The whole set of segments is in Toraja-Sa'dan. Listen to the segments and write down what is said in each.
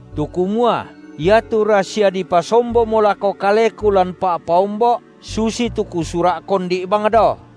tu kumua iatu rasia dipasombomo lako kaleku lan pa’paombo’ susitu kusura’ kondi’ bang dao.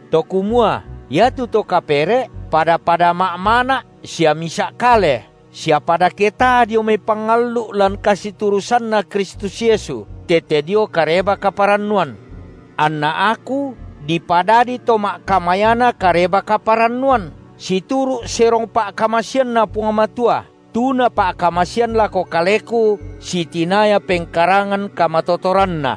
to kumua iatu to kapere’ pada-pada ma’mana’ sia misa’ kale sia pada ketaa dio mai pangallu’ lan kasiturusanNa Kristus Yesu tete dio Kareba-kaparannuan. Anna aku dipadadi to ma’kamayana Kareba-kaparannuan, situru’ serong pa’kamaseanNa Puang Matua, tu Napa’kamasean lako kaleku sitinaya pengkarangan kamatotoranNa.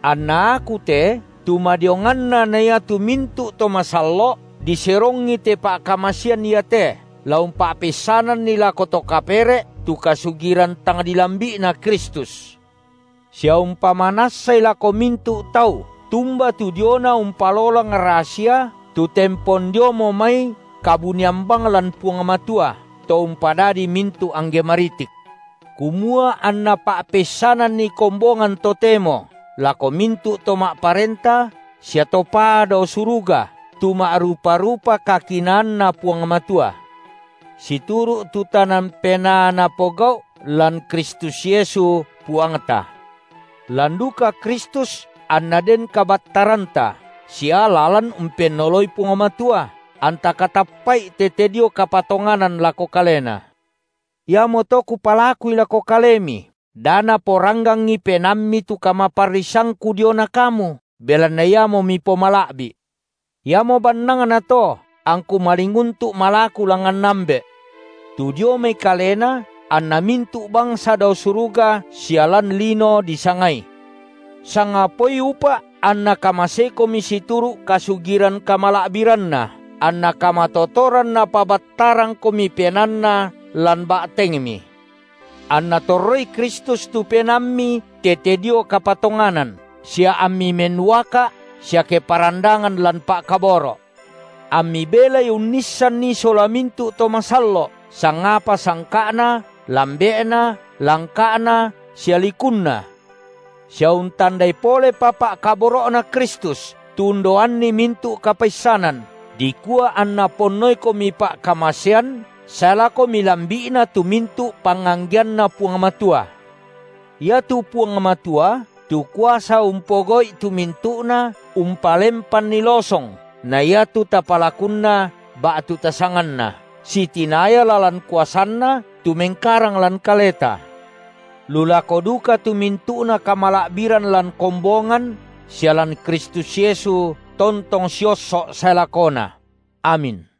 Anna aku te, tu madionganna na iatu mintu’ to masallo’, diserongi te pa’kamasean iate, la umpa’peissananni lako to kapere’ tu kasugiran tang dilambi’Na Kristus, sia umpamanassai lako mintu’ tau tumba tu diona umpalolang rasia tu tempon diomo mai kabunian bang lan Puang Matua, To umpadadi mintu’ angge maritik, kumua anna pa’peissananni kombongan totemo lako mintu’ to ma’parenta sia to paa dao suruga tu ma’rupa-rupa kakinaanNa Puang Matua, situru’ tu tanan penaa Napogau’ lan Kristus Yesu, Puangta. Lan duka Kristus anna den kabattaranta sia lalan umpennoloi Puang Matua anta katappa’I tete dio kapatonganan lako Kalena. Iamoto kupalakui lako kalemi, da naporanggangi penaammi tu kamaparrisangku diona kamu, belanna iamo mipomala’bi’. Iamo bannangnato, angku malinguntu’ malaku langngan Ambe’, tu dio mai Kalena anna mintu’ bangsa dao suruga sia lan lino disangai, sangapaoi upa’ anNa kamaseikomi situru’ kasugiran kamala’biranNa, anna kamatotoran Napabattarangkomi PenaanNa lan ba’tengmi, anNa torroi Kristus tu penaammi tete dio kapatonganan sia ammi mennuaka’ sia keparandangan lan pa’kaboro’, ammi belai unnissanni sola mintu’ to masallo’, sangapa sangka’na, lambe’na, langka’na sia likunna, sia untandai polepa pa’kaboro’Na Kristus, tu undaoanni mintu’ kapaissanan, dikua anna ponnoikomi pa’kamasean sae lako milambi’na tu mintu’ panganggeanna Puang Matua. Iatu Puang Matua tu kuasa umpogau’i tu mintu’na umpelempanni losong, na iatu tapalakunna ba’tu tasanganna, sitinaya lalan kuasanNa tu mengkarang lan kaleta, lu lako duka tu mintu’na kamala’biran lan kombongan sia lan Kristus Yesu tontong siosso’ sae lakona! Amin.